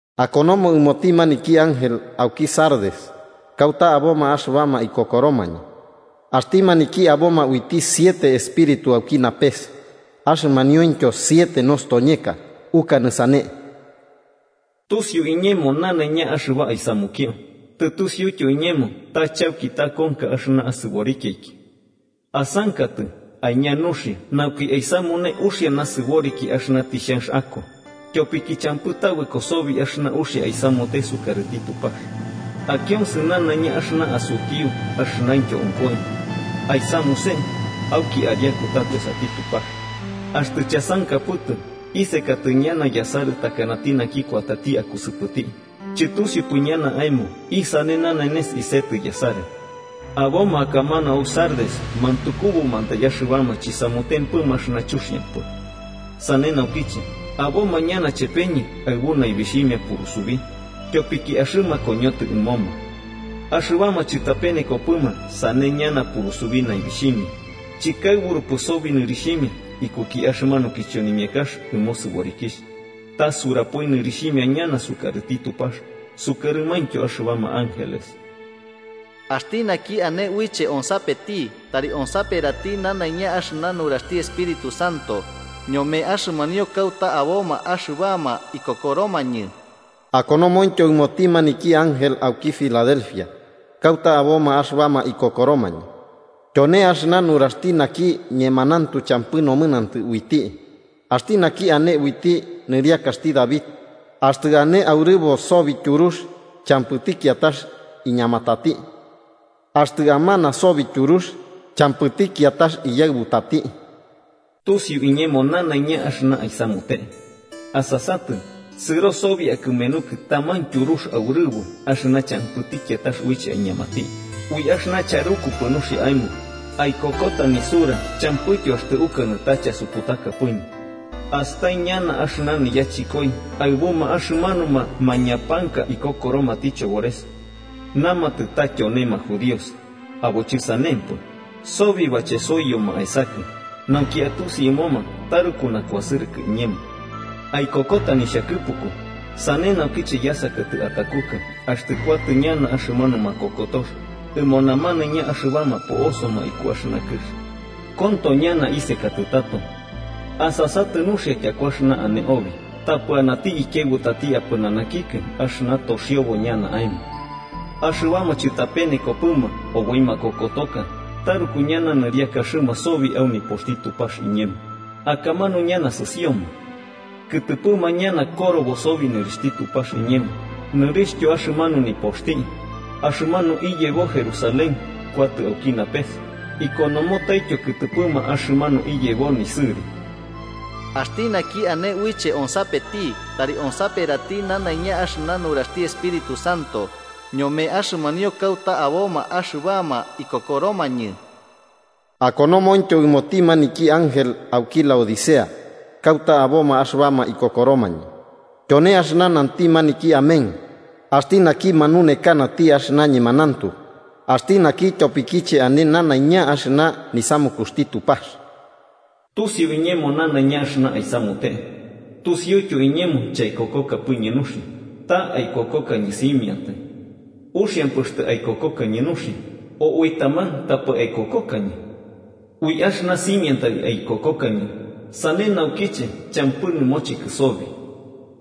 “Akonomo ɨmoti maniki ángel auki Sardes kauta aboma axɨbama ikokoromañɨ: ‘Axti maniki aboma uiti siete espíritu auki napes, axɨmaniointyo siete nostoñeka, ukanɨ sane: tusiu iñemo nanaiña axɨba aisamukio, tusiuityo iñemo ta chauki takonka axɨna asɨborikiaiki. Asankatɨ, aiña nuxia nauki aisamune uxia nasɨboriki axɨna tixhanx ako, tyopiki champɨ tabɨko sobi axɨna uxia aisamute sukarɨti Tupax. Akionsɨ nanaiña axɨna asutiu axɨnaintyo onkoi. Aisamuse, auki ariaku tato esati Tupax. Axtɨ chasankapɨtɨ, isekatɨ ñana yasarɨ takanati naki kuatati akusɨpɨti, chɨtusiupɨ ñana aemo isane nanenes isetɨ yasarɨ. Aboma akamanu au Sardes mantukubumantai axɨbama chisamutempɨma axɨna chuxiampɨ. Sane naukiche, aboma ñana chepeñɨ aɨbu naibixhimia purusubi, tyopiki axɨma koñotɨ ɨmoma. Axɨbama chɨtapenekopɨma sane ñana purusubi naibixhimia, chɨkaɨburupɨ sobi nɨrixhimia ikuki axɨmanu kichonimiakax ɨmo sɨborikixh, ta surapoi nɨrixhimia ñana sukarɨti Tupax sukarɨmaintyo axɨbama ángeles. ¡Axti naki ane uiche onsapeti, tari onsaperati nanaiña axɨna nuraxti Espíritu Santo ñome axɨmanio kauta aboma axɨbama ikokoromañɨ!’ “Akonomointyo ɨmoti maniki ángel auki Filadelfia kauta aboma axɨbama ikokoromañɨ: ‘Tyone axɨna nuraxti naki ñemanauntu champɨ nomɨnantɨ uiti, axti naki ane uiti nɨriakaxti David, axtɨ ane aurɨbo sobi tyurux champɨti kiatax iñamatati, axtɨ amana sobi tyurux champɨti kiatax iyaɨbutati: Tusiu iñemo nanaiña axɨna aisamute. Asasatɨ, sɨro sobi akɨmenukɨ taman tyurux aurɨbo axɨna champɨti kiatax uiche aiñamati, ui axɨna charukupɨ nuxia aemo, aikokota nisura champɨityo axtɨ ukanɨ ta chasuputakapɨñɨ. Astai ñana axɨna niyachɨkoi aɨbuma axɨmanuma mañapanka ikokoromati chobores. Namatɨ ta tyonema judíos, abo chɨsanempɨ, sobi bachesoiyoma aesakɨ, nauki atusi ɨmoma taruku nakuasɨrɨkɨ iñemo. Aikokota nixhakɨpuku, sane naukiche yasakatɨ atakukɨ axtɨ kuatɨ ñana axɨmanu makokotox ɨmo namanaiña axɨbama po'osoma iku axɨna kɨx. Konto ñana isekatɨ tato. Asasatɨ nuxia tyaku axɨna ane obi tapɨ anati ikiaɨbutati apɨnanakikɨ axɨna toxiobo ñana aemo. Axɨbama chɨtapenekopɨma oboi makokotoka taruku ñana nɨriakaxɨma sobi au nipoxti Tupax iñemo, akamanu ñana sɨsioma. Kɨtɨpɨma ñana korobo sobi nɨrixhti Tupax iñemo nɨrixhtyo axɨmanu nipoxti, axɨmanu iyebo Jerusalén kuatɨ auki napes, ikonomotaityo kɨtɨpɨma axɨmanu iyebo nisɨri. ¡Axti naki ane uiche onsapeti, tari onsaperati nanaiña axɨna nuraxti Espíritu Santo ñome axɨmanio kauta aboma axɨbama ikokoromañɨ!’ “Akonomointyo ɨmoti maniki ángel auki Laodicea kauta aboma axɨbama ikokoromañɨ: ‘Tyone axɨna nanti maniki Amén, axti naki manunekanati axɨna ñemanauntu, axti naki tyopikiche ane nanaiña axɨna nisamukuxti Tupax: Tusiu iñemo nanaiña axɨna aisamute. Tusiuityo iñemo chaikokokapɨñɨ nuxia, ta aikokokañɨ simiantai. ¡Uxiampɨ axtɨ aikokokañɨ nuxia, o ui taman tapɨ aikokokañɨ! Ui axɨna simiantai aikokokañɨ, sane naukiche champɨ nɨmochekɨ sobi.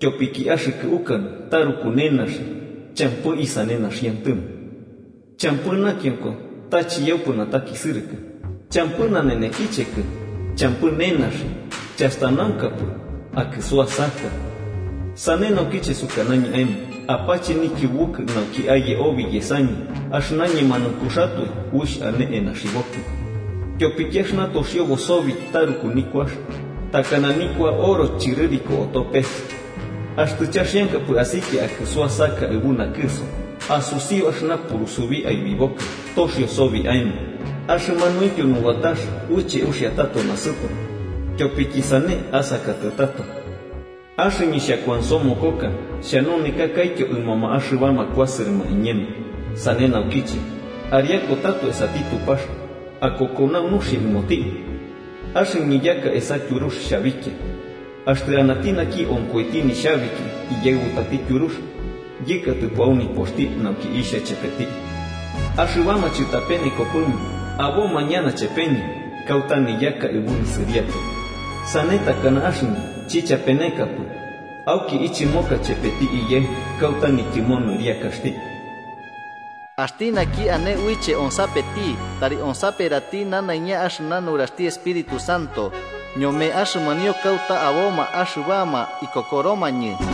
Tyopiki axɨkɨ ukanɨ taruku nenaxi, champɨ isane naxiantɨmo. Champɨ nakionko ta chiyaupɨ natakisɨrɨkɨ, champɨ nanenekichekɨ, champɨ nenaxi, chastanaunkapɨ, akɨsuasaka. Sane naukiche sukanañɨ aemo apache nikiubukɨ nauki aye obi yesakiñɨ axɨna ñemanaunkuxatoe uixh ane enaxibokɨ. Tyopiki axɨna toxiobo sobi taruku nikuax, takana nikua oro chɨrɨriko oto pes. Axtɨ chaxiankapɨ asikia akɨsuasaka aɨbu nakɨso, asusiu axɨna purusubi aibibokɨ toxio sobi aemo, axɨmanuintyo nubatax uiche uxia tato nasɨto. Tyopiki sane asakatɨ tato. Axɨñɨ xhakuansomokoka xhanunekakaityo ɨmoma axɨbama kuasɨrɨma iñemo. Sane naukiche, ariaku tato esati Tupax akokonau nuxia ɨmoti. Axɨñɨ yaka esa tyurux xhabikia. Axtɨ anati naki onkoiti nixhabiki iyaɨbutati tyurux yɨkatɨpo au nipoxti nauki ixha chepeti. Axɨbama chɨtapenekopɨma aboma ñana chepeñɨ kauta niyaka aɨbu nisɨriaka, sane takana axɨñɨ chichapenekapɨ auki ichɨmoka chepeti Iyaɨ kauta nityɨmo nɨriakaxti. ¡Axti naki ane uiche onsapeti, tari onsaperati nanaiña axɨna nuraxti Espíritu Santo ñome axɨmanio kauta aboma axɨbama ikokoromañɨ!’”